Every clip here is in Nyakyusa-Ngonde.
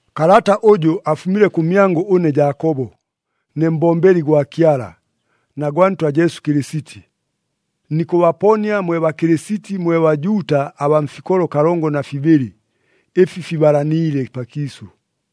Kalata ʉjʉ afumile kʉmyangʉ ʉne Jaakobo, ne mbombeli gwa Kyala, na gwa Ntwa Jesu Kɨlɨsiti. Nikʉbaponia mwe Bakɨlɨsiti mwe Bajuuta abaa mfikolo kalongo na fibɨlɨ, ɨfi fibalaniile pakiisʉ.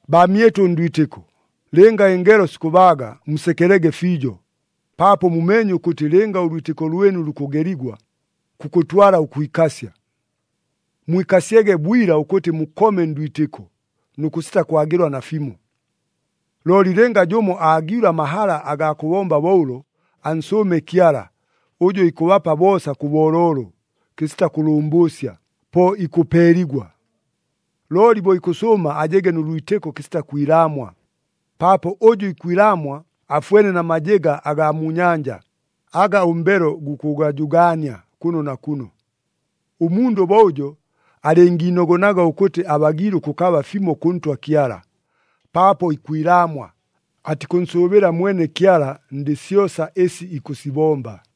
Baamyɨtʉ ndwitɨko, lɨnga ɨngelo sikʉbaaga, musekelege fiijo, paapo mumeenye ʉkʉtɨ lɨnga ʉlwitɨko lwɨnu lukʉgeligwa, kukʉtwala ʉkwikasya. Mwikasyege bwila ʉkʉtɨ mukome ndwitɨko, nʉ kʉsita kwagɨlwa nafimo. Looli lɨnga jʉmo aagiilwe amahala agaa kʉbomba bo ʉlo, ansʉʉme Kyala, ʉjʉ ikʉbapa boosa kʉ booloolo, kɨsita kʉlʉmbʉʉsya, po ikʉpeeligwa. Looli bo ikʉsʉʉma ajege nʉ lwitɨko kɨsita kwilaamwa, paapo ʉjʉ ikwilaamwa afwene na majɨga agaa mu nyanja, aga ʉmbelo gukʉgajʉgaania kʉno na kʉno. Ʉmundʉ bo ʉjo alɨngiinogonaga ʉkʉtɨ abagiile ʉkʉkaba fimo kʉ Ntwa Kyala, paapo ikwilaamwa, atikʉnsʉʉbɨla mwene Kyala ndɨ syosa ɨsi ikʉsibomba.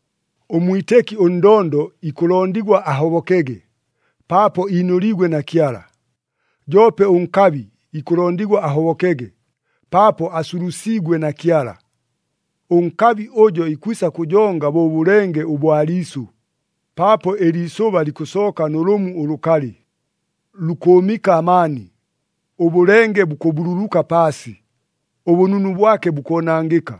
Ʉmwitɨki ʉndondo ikʉlondigwa ahobokege, paapo iinʉliigwe na Kyala. Joope ʉnkabi ikʉlondigwa ahobokege, paapo asulusiigwe na Kyala. Ʉnkabi ʉjo ikwisa kʉjonga bo ʉbʉlenge ʉbwa liisʉ, paapo ɨliisʉba likʉsooka nʉ lʉmu ʉlʉkalɨ, lukʉʉmɨka amaani, ʉbʉlenge bukʉbululuka paasi, ʉbʉnunu bwake bukoonangɨka.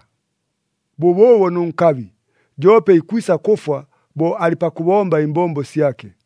Bʉbʉʉbo nʉ nkabi, joope ikwisa kʉfwa bo alɨ pakʉbomba ɨmbombo syake.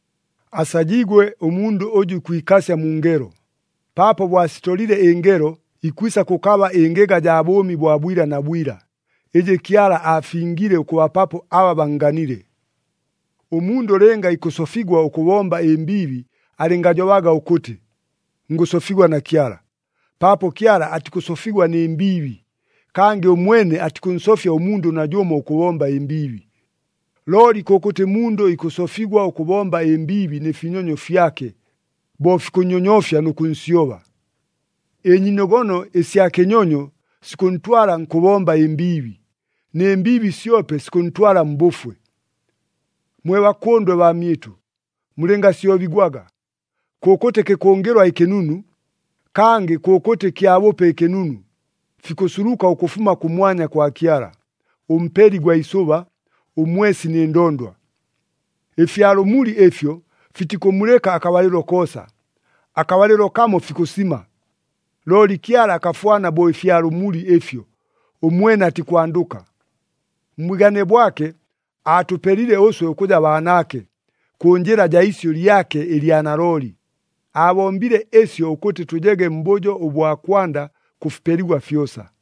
Asajiigwe ʉmundʉ ʉjʉ ikwikasya mu ngelo, paapo bo asitolile ɨngelo, ikwisa kʉkaba ɨngɨga jaa bʉʉmi bwa bwila na bwila, ɨjɨ Kyala aafingile ʉkʉbapapo aba bannganile. Ʉmundʉ lɨnga ikʉsofigwa ʉkʉbomba ɨmbiibi alɨngajobaga ʉkʉtɨ, “Ngʉsofigwa na Kyala,” paapo Kyala atikʉsofigwa nɨ mbiibi, kangɨ ʉmwene atikʉnsofya ʉmundʉ najʉmo ʉkʉbomba ɨmbiibi. Looli kʉkʉtɨ mundʉ ikʉsofigwa ʉkʉbomba ɨmbiibi nɨ finyonyo fyake, bo fikʉnnyonyofya nʉ kʉnsyoba. Ɨnyiinogono ɨsya kɨnyonyo sikʉntwala nkʉbomba ɨmbiibi, nɨ mbiibi syope sikʉntwala mbʉfwe. Mwe bakʉndwe baamyɨtʉ, mulɨngasyobigwaga. Kʉkʉtɨ kɨkʉngɨlwa ɨkɨnunu, kangɨ kʉkʉtɨ kyabʉpe ɨkɨnunu, fikʉsuluka ʉkʉfuma kʉmwanya kwa Kyala, ʉMpeli gwa isʉba, ʉmwesi nɨ ndondwa. Ɨfya lʉmuli ɨfyo fitikʉmulɨka akabalɨlo koosa, akabalɨlo kamo fikʉsima. Looli Kyala akafwana bo ɨfya lʉmuli ɨfyo, ʉmwene atikwandʉka. Mbwigane bwake aatʉpelile ʉswe ʉkʉja baanaake, kʉ njɨla jaa isyʉ lyake ɨlya nalooli. Aabombile ɨsyo ʉkʉtɨ tʉjege mbʉjo ʉbwa kwanda kʉ fipeligwa fyosa.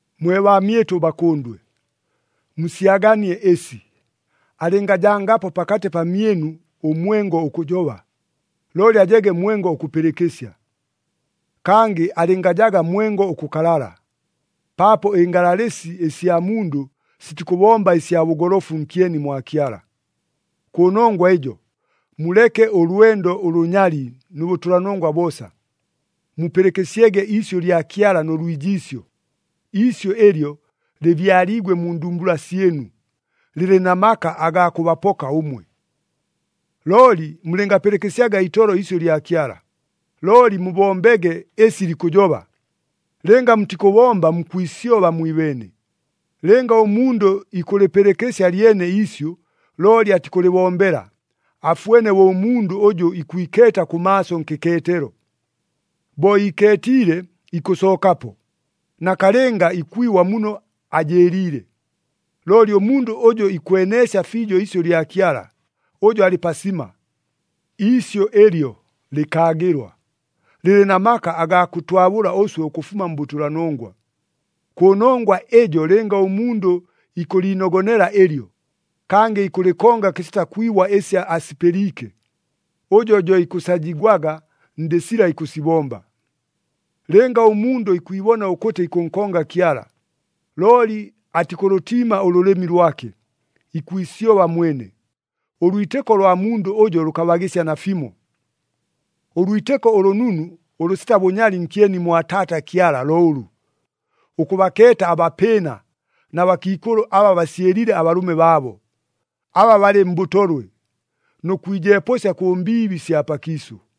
Mwe baamyɨtʉ bakʉndwe, musyaganie ɨsi, alɨngajangapo pakatɨ pamyɨnu ʉmwengo ʉkʉjoba, looli ajege mwengo ʉkʉpɨlɨkɨsya. Kangɨ alɨngajaga mwengo ʉkʉkalala, paapo ɨngalalɨsi ɨsya mundʉ sitikʉbomba ɨsya bʉgolofu nkyeni mwa Kyala. Kʉnongwa ɨjo, muleke ʉlwendo ʉlʉnyali nʉ bʉtʉlanongwa boosa. Mupɨlɨkɨsyege iisyʉ lya Kyala nʉ lwijiisyo. Iisyʉ ɨlyo lɨbyaliigwe mu ndumbula syɨnu, lɨlɨ na maka agaa kʉbapoka ʉmwe. Looli mulɨngapɨlɨkɨsyaga itolo iisyʉ lya Kyala, looli mubombege ɨsi likʉjoba. Lɨnga mutikʉbomba mukwisyoba mwibeene. Lɨnga ʉmundʉ ikʉlɨpɨlɨkɨsya lyene iisyʉ, looli atikʉlɨbombela, afwene bo ʉmundʉ ʉjʉ ikwikeeta kʉmaaso nkɨkeetelo. Bo ikeetiile, ikʉsookapo, nakalɨnga ikwibwa muno ajɨɨliile. Looli ʉmundʉ ʉjʉ ikweneesya fiijo iisyʉ lya Kyala, ʉjo alɨ pasima. Iisyʉ ɨlyo lɨkaagɨlwa, lɨlɨ na maka agaa kʉtwabʉla ʉswe ʉkʉfuma mbʉtʉlanongwa. Kʉnongwa ɨjo lɨnga ʉmundʉ ikʉliinogonela ɨlyo, kangɨ ikʉlɨkonga kɨsita kwibwa ɨsi asipɨliike, ʉjo jo ikʉsajigwaga ndɨ sila ikʉsibomba. Lɨnga ʉmundʉ ikwibona ʉkʉtɨ ikʉnkonga Kyala, looli atikʉlʉtiima ʉlʉlɨmi lwake, ikwisyoba mwene, ʉlwitɨko lwa mundʉ ʉjo lʉkabagɨsya nafimo. Ʉlwitɨko ʉlʉnunu ʉlʉsita bʉnyali nkyeni mwa Taata Kyala lo ʉlʉ, ʉkʉbakeeta abapɨɨna na bakiikʉlʉ aba basyɨlɨle abalʉme baabo, aba balɨ mbʉtolwe, nʉ kwijepʉsya kʉ mbiibi sya pakiisʉ.